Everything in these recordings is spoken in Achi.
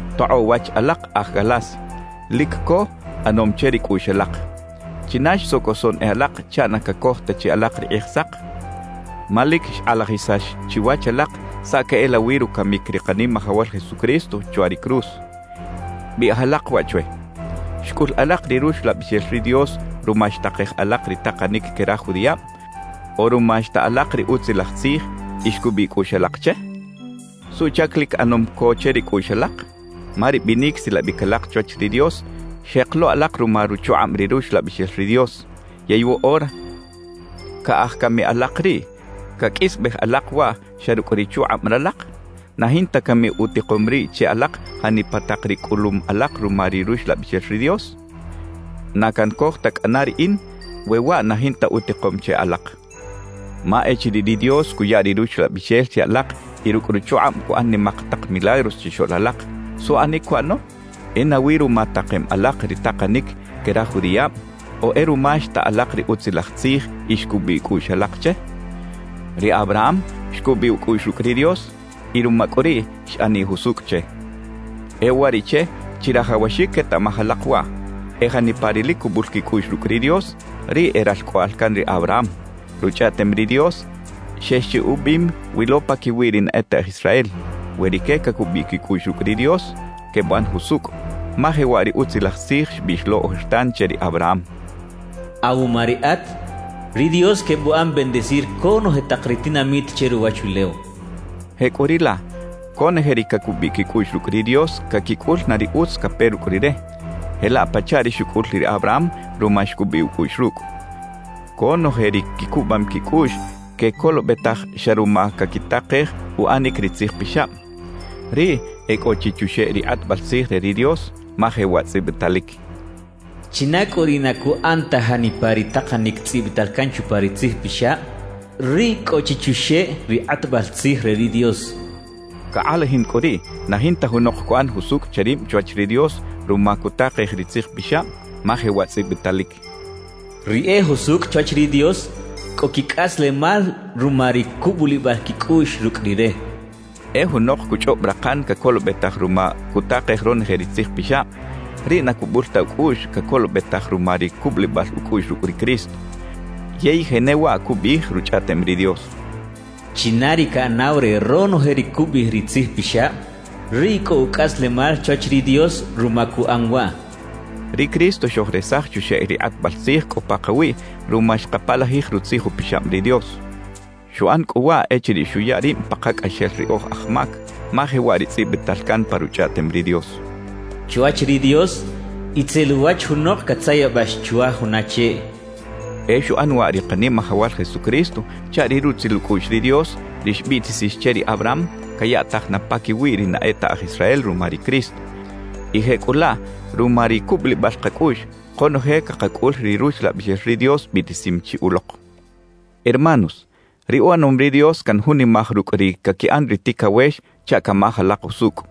¡Tokꞌoꞌ wach alak aj Galacia! Lic co ꞌanom che ri cꞌuꞌx alak. ¿China xsocosoꞌn e alak chaꞌ na cacoj ta chi alak ri Kꞌijsak? Ma lic xkꞌalajisax chiwach alak saꞌ queꞌelawi rucamic ri Kanimajawal Jesucristo chwa ri cruz. Biꞌij alak waꞌ chwe: ¿Xcꞌul alak ri Ruxlabixel ri Dios ruma xtakej alak ri takanic que raj judiꞌab o ruma xta alak ri Utzilaj Tzij y xcubiꞌ cꞌuꞌx alak che? ¿Suꞌchac lic ꞌanom co che ri cꞌuꞌx alak? Ma ri binic silabic alak chwach ri Dios xjek lo alak ruma ruchukꞌab ri Ruxlabixel ri Dios, yey woꞌora ¿caꞌaj cami alak riꞌ caqꞌuisbej alak waꞌ xa rucꞌ ri chukꞌab ralak? ¿Na jinta cami utikom riꞌ che alak janipa tak ri cꞌulum alak ruma ri Ruxlabixel ri Dios? Na cancoj ta cꞌana riꞌin we waꞌ na jinta utikom che alak. Ma echiriꞌ ri Dios cuya ri Ruxlabixel che alak y rucꞌ ruchukꞌab cuꞌan nimak tak milagros chixoꞌl alak, ¿suꞌanic cuꞌano? ¿E nawi ruma takem alak ri takanic que raj judiꞌab o e ruma xta alak ri Utzilaj Tzij y xcubiꞌ cꞌuꞌx alak che? Ri Abraham xcubiꞌ ucꞌuꞌx rucꞌ ri Dios y ruma cꞌu riꞌ xꞌaniꞌ jusucꞌ che. E uwariꞌche, chirajawaxic quetaꞌmaj alak waꞌ: E janipa ri lic cubul quicꞌuꞌx rucꞌ ri Dios, riꞌ e ralcꞌoꞌal can ri Abraham. Ruchꞌaꞌtem ri Dios xex chi ubiꞌim wi lo paquiwi ri na e ta aj Israel, we rique cacubiꞌ quicꞌuꞌx rucꞌ ri Dios, quebuꞌan jusucꞌ. Ma jewaꞌ ri utzilaj tzij xbiꞌx lo ojertan che ri Abraham: Awuma riꞌat, ri Dios quebuꞌan bendecir conoje tak ri tinamit che ruwachulew. Jecꞌuriꞌlaꞌ, conoje ri cacubiꞌ quicꞌuꞌx rucꞌ ri Dios caquicꞌul na ri utz cape rucꞌ Rire, jelaꞌ pachaꞌ ri xucꞌul ri Abraham ruma xcubiꞌ ucꞌuꞌx rucꞌ. Conoje ri quicubam quicꞌuꞌx quecolobetaj xa ruma caquitakej uꞌanic ri tzij pixab, riꞌ e cꞌo chi chuxeꞌ ri kꞌatbal tzij re ri Dios, ma jewaꞌ tzꞌibitalic: China cꞌu ri na cuꞌan ta janipa ri takanic tzꞌibital can chupa ri Tzij Pixab, riꞌ cꞌo chi chuxeꞌ ri kꞌatbal tzij re ri Dios cachaꞌ. Cakꞌalajin cꞌu riꞌ, na jinta junok cuꞌan jusucꞌ che rib chwach ri Dios ruma cutakej ri Tzij Pixab, ma jewaꞌ tzꞌibitalic: Ri e jusucꞌ chwach ri Dios, cꞌo quicꞌaslemal ruma ri cubulibal quicꞌuꞌx rucꞌ Rire cachaꞌ. E junok cuchꞌob rakan cacolobetaj ruma cutakej ronoje ri Tzij Pixab, riꞌ na cubul ta ucꞌuꞌx cacolobetaj ruma ri cubulibal ucꞌuꞌx rucꞌ ri Cristo. Yey jenewaꞌ cubiꞌij Ruchꞌaꞌtem ri Dios: China ri caꞌanaw re ronoje ri cubiꞌij ri Tzij Pixab, riꞌ cꞌo ucꞌaslemal chwach ri Dios ruma cuꞌan waꞌ cachaꞌ. Ri Cristo xojresaj chuxeꞌ ri kꞌatbal tzij cꞌo pakawiꞌ ruma xkapalajij Rutzij Upixab ri Dios; xuꞌan cꞌu waꞌ echiriꞌ xuya rib pakacꞌaxel ri oj aj mac, ma jewaꞌ ri tzꞌibital can pa Ruchꞌaꞌtem ri Dios: Chwach ri Dios, itzel uwach junok catzayabax chwa juna cheꞌ. E xuꞌan waꞌ ri Kanimajawal Jesucristo chaꞌ ri rutzil ucꞌuꞌx ri Dios, ri xbiꞌtisix che ri Abraham, cayaꞌtaj na paquiwi ri na e ta aj Israel ruma ri Cristo; y jecꞌulaꞌ ruma ri cubulibal kacꞌuꞌx, konoje cakacꞌul ri Ruxlabixel ri Dios biꞌtisim chi ulok. Hermanos, ri uꞌanom ri Dios canjunimaj rucꞌ ri caquiꞌan ri ticawex chaꞌ camaj alak usucꞌ: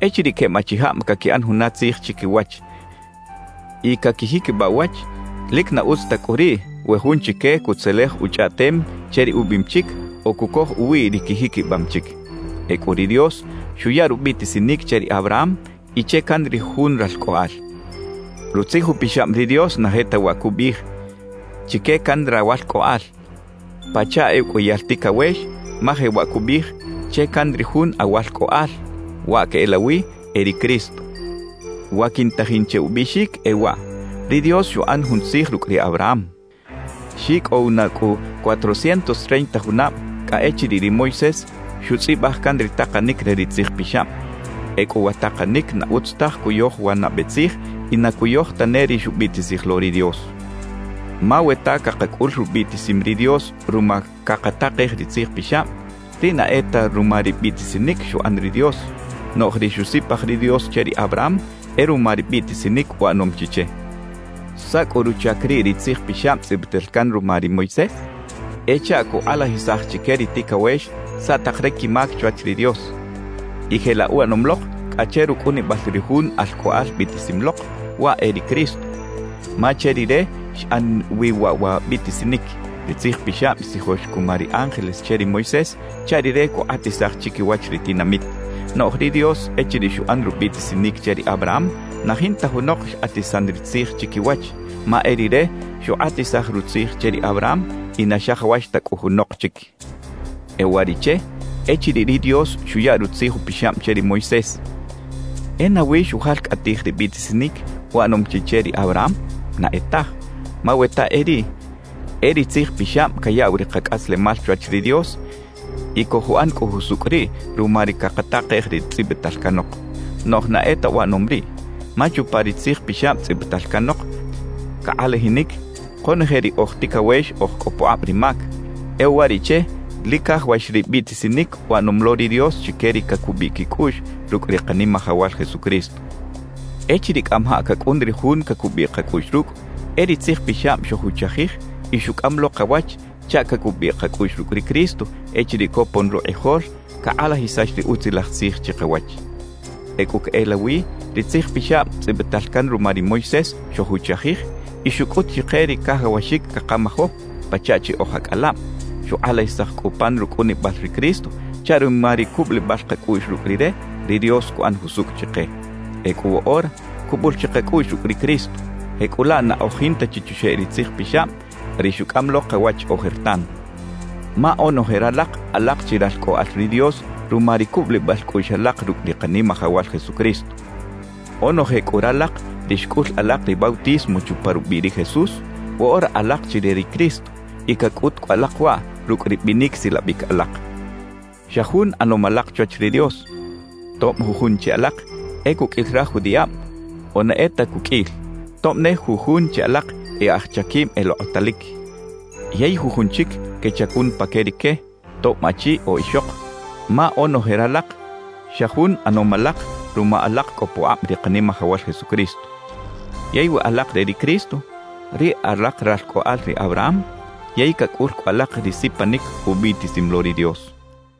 Echiriꞌ queb achijab caquiꞌan juna tzij chiquiwach y caquijiquibaꞌ uwach, lic na utz ta cꞌu riꞌ we jun chique cutzelej uchꞌaꞌtem che ri ubiꞌim chic o cucoj uwiꞌ ri quijiquibam chic. Ecꞌu ri Dios xuya rubiꞌtisinic che ri Abraham y che can ri Jun ralcꞌoꞌal. Rutzij Upixab ri Dios na jetawaꞌ cubiꞌij «chique can rawalcꞌoꞌal», pachaꞌ e uqꞌuiyal ticawex, ma jewaꞌ cubiꞌij «che can ri Jun awalcꞌoꞌal»; waꞌ queꞌelawi e ri Cristo. Wa quintajin che ubiꞌxic e waꞌ: Ri Dios xuꞌan jun tzij rucꞌ ri Abraham. Xicꞌow na cꞌu cuatrocientos treinta junab cꞌa echiriꞌ ri Moisés xutzꞌibaj can ri takanic re ri Tzij Pixab. Ecꞌu wa takanic na utz taj cuyoj wa nabe tzij y na cuyoj tane ri xubiꞌtisij lo ri Dios. Ma we ta cakacꞌul rubiꞌtisim ri Dios ruma cakatakej ri Tzij Pixab, riꞌ na e ta ruma ri biꞌtisinic xuꞌan ri Dios; noꞌj ri xusipaj ri Dios che ri Abraham e ruma ri biꞌtisinic uꞌanom chi che. ¿Saꞌ cꞌu ruchac riꞌ ri Tzij Pixab tzꞌibital can ruma ri Moisés? E chaꞌ cukꞌalajisaj chique ri ticawex saꞌ tak ri quimac chwach ri Dios. Y jelaꞌ uꞌanom lok cꞌa che rucꞌunibal ri Jun Alcꞌoꞌal biꞌtisim lok, waꞌ e ri Cristo; ma che Rire xꞌan wi waꞌ wa biꞌtisinic. Ri Tzij Pixab xtzijox cuma ri ángeles che ri Moisés chaꞌ rire cukꞌatisaj chiquiwach ri tinamit; noꞌj ri Dios echiriꞌ xuꞌan rubiꞌtisinic che ri Abraham, na jinta junok xkꞌatisan ri tzij chiquiwach, ma e Rire xukꞌatisaj rutzij che ri Abraham y na xajawax ta cꞌu junok chic. E uwariꞌche, echiriꞌ ri Dios xuya Rutzij Upixab che ri Moisés, ¿e nawi xujalcꞌatij ri biꞌtisinic uꞌanom chi che ri Abraham? Na e taj. Ma we ta e riꞌ, e ri Tzij Pixab cayaꞌw ri kacꞌaslemal chwach ri Dios, y cojuꞌan cꞌu jusucꞌ riꞌ ruma ri cakatakej ri tzꞌibital canok. Noꞌj na e ta uꞌanom riꞌ. Ma chupa ri Tzij Pixab tzꞌibital canok, cakꞌalajinic konoje ri oj ticawex oj cꞌo pukꞌab ri mac; e uwariꞌche lic cajawax ri biꞌtisinic uꞌanom lo ri Dios chique ri cacubiꞌ quicꞌuꞌx rucꞌ ri Kanimajawal Jesucristo. Echiriꞌ cꞌamajaꞌ cacꞌun ri Jun cacubiꞌ kacꞌuꞌx rucꞌ, e ri Tzij Pixab xojuchajij y xucꞌam lo kawach chaꞌ cacubiꞌ kacꞌuꞌx rucꞌ ri Cristo echiriꞌ copon rukꞌijol cakꞌalajisax ri Utzilaj Tzij chikawach. Ecꞌu queꞌelawi, ri Tzij Pixab tzꞌibital can ruma ri Moisés xojuchajij y xucꞌut chike ri cajawaxic cakamajo, pachaꞌ chi oj acꞌalab; xukꞌalajisaj cꞌu pan rucꞌunibal ri Cristo chaꞌ ruma ri cubulibal kacꞌuꞌx rucꞌ Rire, ri Dios cuꞌan jusucꞌ chike. Ecꞌu woꞌora cubul chi kacꞌuꞌx rucꞌ ri Cristo, jecꞌulaꞌ na oj jinta chi chuxeꞌ ri Tzij Pixab ri xucꞌam lo kawach ojertan. Ma onoje ralak alak chi ralcꞌoꞌal ri Dios ruma ri cubulibal cꞌuꞌx alak rucꞌ ri Kanimajawal Jesucristo. Onoje cꞌu ralak ri xcꞌul alak ri bautismo chupa rubiꞌ ri Jesús, woꞌora alak chi re ri Cristo y cacꞌut cꞌu alak waꞌ rucꞌ ri binic silabic alak. Xa jun ꞌanom alak chwach ri Dios, tob jujun che alak e cuqꞌuil raj judiꞌab o na e ta cuqꞌuil, tob ne jujun che alak e aj chaquib elokꞌotalic yey jujun chic quechacun pa que rique, tob achi o ixok; ma onoje ralak, xa jun ꞌanom alak ruma alak cꞌo pukꞌab ri Kanimajawal Jesucristo. Yey we alak re ri Cristo, riꞌ alak ralcꞌoꞌal ri Abraham yey cacꞌul cꞌu alak ri sipanic ubiꞌtisim lo ri Dios.